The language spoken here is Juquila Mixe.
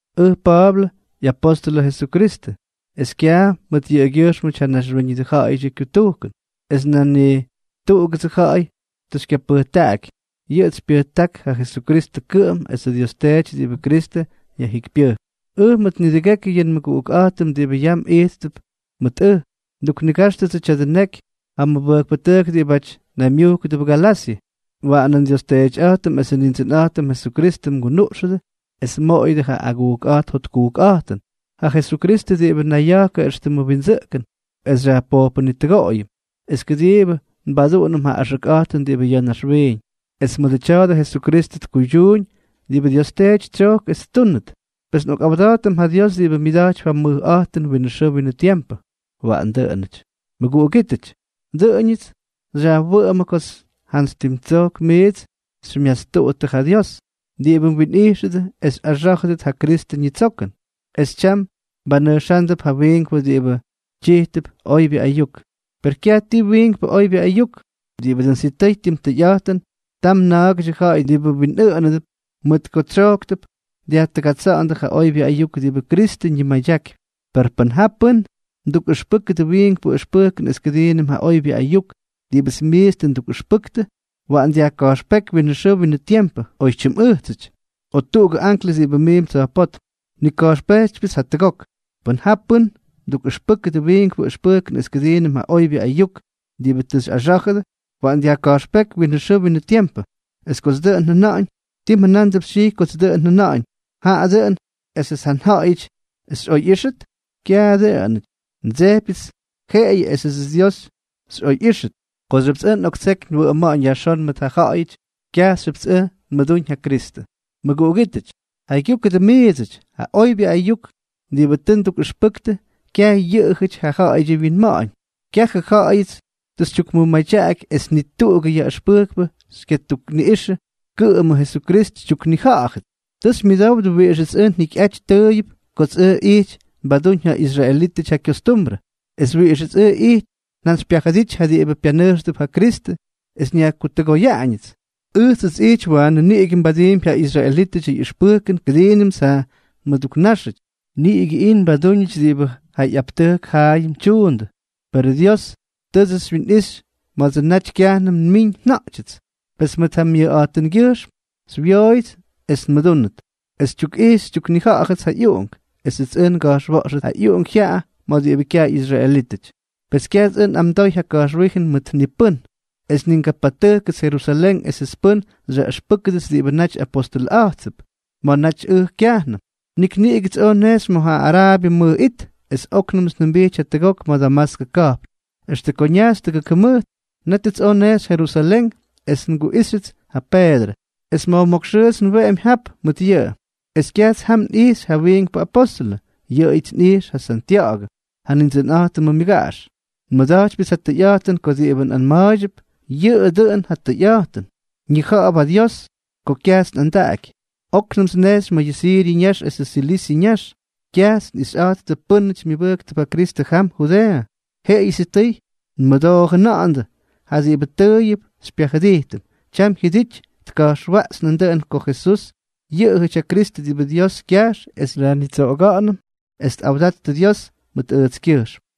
Ʉj Pa̱a̱blʉ, ꞌyapóstʉlʉ Jesukristʉ, es kyaj mʉt yʉꞌʉgyʉjxmʉty ja naxwíñʉdʉ ja̱ꞌa̱yʉdyʉ kyutujkʉn, es nan ni tuꞌugʉdsʉ ja̱ꞌa̱y tʉ xykyapʉjtaꞌaky, yʉꞌʉts xypyʉjtáktʉ ja Jesukristʉ kʉꞌʉm esʉ Dios Teety diꞌibʉ Kristʉ yajjikypyʉjk. Ʉj mʉt nidʉgekyʉ yʉ nmʉguꞌukꞌa̱jtʉm diꞌibʉ yam ijttʉp mʉt ʉj, nduknigáxtʉdsʉ tya̱dʉ neky ja mʉbʉjkpʉtʉjk diꞌibáty naymyujkʉdʉp Galasyʉ. Waꞌanʉ nDios Teetyꞌa̱jtʉm esʉ Nindsʉnꞌa̱jtʉm Jesukristʉ mgunuꞌxʉdʉ es mmoꞌoyʉdʉ ja agujkꞌa̱jt jotkujkꞌa̱jtʉn, ja Jesukristʉ diꞌibʉ nayya̱jkʉ éxtʉmʉ windsʉꞌkʉn es xyajpojpʉnitʉgoꞌoyʉm es kʉdiibʉ nbaduꞌunʉm ja axʉkꞌa̱jtʉn diꞌibʉ ya̱ naxwiiñ, es mʉdʉ tya̱a̱dʉ Jesukristʉ tkuydyuuñ diꞌibʉ Dios Teety tsyojk es ttúnʉt. Pes nꞌokꞌawda̱jtʉm ja Dios diꞌibʉ myʉda̱jtypy ja mʉjꞌa̱jtʉn winʉ xʉʉ winʉ tiempʉ. Waꞌan dʉꞌʉnʉty. Mʉguꞌugítʉty, dʉꞌʉñʉts xyajwʉꞌʉmʉ ko jantsy tim tsojk miits xymyastuꞌuttʉ ja Dios, diꞌibʉ mwinꞌijxʉdʉ es xyꞌaxá̱jʉt ja Kristʉ ñitsokʉn, es tyam mbanʉjxándʉp ja wiinkpʉ diꞌibʉ tyijtʉp oybyʉ ayuk. Per kyaj ti wiinkpʉ oybyʉ ayuk. Diꞌibʉ dʉn sitʉy tim tʉyꞌa̱jtʉn, tam na̱a̱gʉdyʉ ja̱ꞌa̱y diꞌibʉ mwinꞌʉʉnánʉdʉp mʉt ko tsyojktʉp dyajtʉgatsa̱ꞌa̱ndʉ ja oybyʉ ayuk diꞌibʉ Kristʉ ñimadyakypy. Per pʉn ja pʉ́n mdukꞌʉxpʉ́kʉdʉ wiinkpʉ ʉxpʉjkʉn es kʉdiinʉm ja oybyʉ ayuk diꞌibʉts miits tʉ ndukꞌʉxpʉktʉ, waꞌan yajka̱jxpéky winʉ xʉʉ winʉ tiempʉ, oy tyimꞌʉjtsʉty, o tuꞌugʉ anklʉs diꞌibʉ miimp tsa̱jpótm. Nnika̱jxpejtypyʉts jatʉgok. Pʉn ja pʉ́n mdukꞌʉxpʉ́kʉdʉ wiinkpʉ ʉxpʉjkʉn es kʉdiinʉm ja oybyʉ ayuk diꞌibʉ tʉ xyꞌaxá̱jʉdʉ, waꞌan yajka̱jxpéky winʉ xʉʉ winʉ tiempʉ. Es kots dʉꞌʉn njʉna̱ꞌa̱ñ, ¿tii mjʉna̱a̱mp xytyijy kots dʉꞌʉn njʉna̱ꞌa̱ñ, jaꞌa dʉꞌʉn esʉts ja ja̱ꞌa̱yʉty xyꞌoyꞌíxʉt? Kyajʉ dʉꞌʉn. Ndsejpyʉts jeꞌeyʉ esʉdsʉ Dios xyꞌoyꞌíxʉt. Kooxyʉpts ʉj ndseky nwʉꞌʉma̱ꞌa̱ñ yajxón mʉt ja ja̱ꞌa̱yʉty, kyajxyʉpts ʉj nmʉdúñ ja Kristʉ. Mʉguꞌugítʉty, jaygyúkʉdʉ miidsʉty, ja oybyʉ ayuk diꞌibʉ tʉ ndukꞌʉxpʉktʉ, kyaj yʉꞌʉjʉty ja ja̱ꞌa̱yʉdyʉ wyinma̱ꞌa̱ñ. Kyajʉ ja̱ꞌa̱yʉts xytyukmʉmadyaky es ni tuꞌugʉ yaꞌʉxpʉjkpʉ xykyatukniꞌijxʉ, kʉꞌʉmʉ Jesukristʉ xytyuknija̱ꞌa̱jʉts. Tʉ xymyʉdowdʉ wiꞌixʉts ʉj njikyꞌajty tʉʉyʉp kots ʉj ijty nbadúñ ja israelítʉty ja kyostumbrʉ, es wiꞌixʉts ʉj ijty njantsypyajʉdity ja diꞌibʉ pyanʉjxtʉp ja Kristʉ es nyajkutʉgoyáñʉts. Ʉjts ijty waanʉ niꞌigʉ nbadiimpy ja israelítʉdyʉ ꞌyʉxpʉjkʉn kʉdiinʉmts ja nmʉduknáxʉty, niꞌigʉ ijty nbadúñʉts diꞌibʉ ja ꞌyaptʉjk jaayʉm tyuundʉ. Perʉ Dios tʉʉdsʉ naty xywyinꞌixy ma̱dsʉ naty kyajnʉm nmiñ nja̱ꞌtyʉts. Pes mʉt ja myayꞌa̱jtʉngyʉjxm xywyooyʉts esʉts nmʉdúnʉt, esʉts xytyukꞌijxy xytyuknija̱ꞌa̱jʉts ja ꞌyUꞌunk, esʉts ʉj nga̱jxwa̱ꞌxʉt ja ꞌyUꞌunk jyaꞌa ma̱ diꞌibʉ kyaj ꞌyisraelítʉty. Pes kyajts ʉj nꞌamdooy ja ka̱jxwíjʉn mʉt ni pʉ́n. Es ni ngapatʉjkʉts Jerusalén esʉts pʉ́n xyaꞌʉxpʉ́kʉdʉts diꞌibʉ naty apostʉlʉꞌa̱jttʉp ma̱ naty ʉj kyajnʉm, nik niꞌigʉts oj nnejxy ma̱ ja Araabyʉ mʉj it, es óknʉmts njʉmbijty jatʉgok ma̱ Damaskʉ ka̱jpn. Extʉ ko ñajxy tʉgʉk jʉmʉjt, nétʉts oj nnejxy Jerusalén es nguꞌijxyʉts ja Peedrʉ. Es ma̱jmókx xʉʉts nweꞌemy jap mʉt yʉꞌʉ. Es kyajts jam nꞌijxy ja wiinkpʉ apóstʉlʉ, yʉꞌʉyʉts nꞌijx ja Santya̱ꞌa̱gʉ, ja Nindsʉnꞌa̱jtʉmʉ myʉgaꞌax. Nmʉda̱jtypyʉts ja tʉyꞌa̱jtʉn ko diꞌibʉ nꞌanma̱a̱ydyʉp, yʉꞌʉ dʉꞌʉn ja tʉyꞌa̱jtʉn. Ñija̱ꞌa̱p ja Dios ko kyajts nꞌandaꞌaky. Oknʉmts nnejxy ma̱ yʉ Siryʉ ñax esʉ Silisyʉ ñax. Kyajts xyꞌixyꞌa̱jttʉ pʉ́nʉty myʉbʉjktʉp ja Kristʉ jam Judeeʉ, jeꞌeyʉ sitʉy tmʉdoo jʉna̱ꞌa̱ndʉ: “Ja diꞌibʉ tʉʉyʉp xypyajʉdijtʉm, tyam jyʉdity tka̱jxwaꞌxy nandʉꞌʉn ko Jesús yʉꞌʉjʉty ja Kristʉ diꞌibʉ Dios kyajx es xyajnitsoꞌoga̱ꞌa̱nʉm.” Es tꞌawdattʉ Dios mʉt ʉjtskyʉjxm.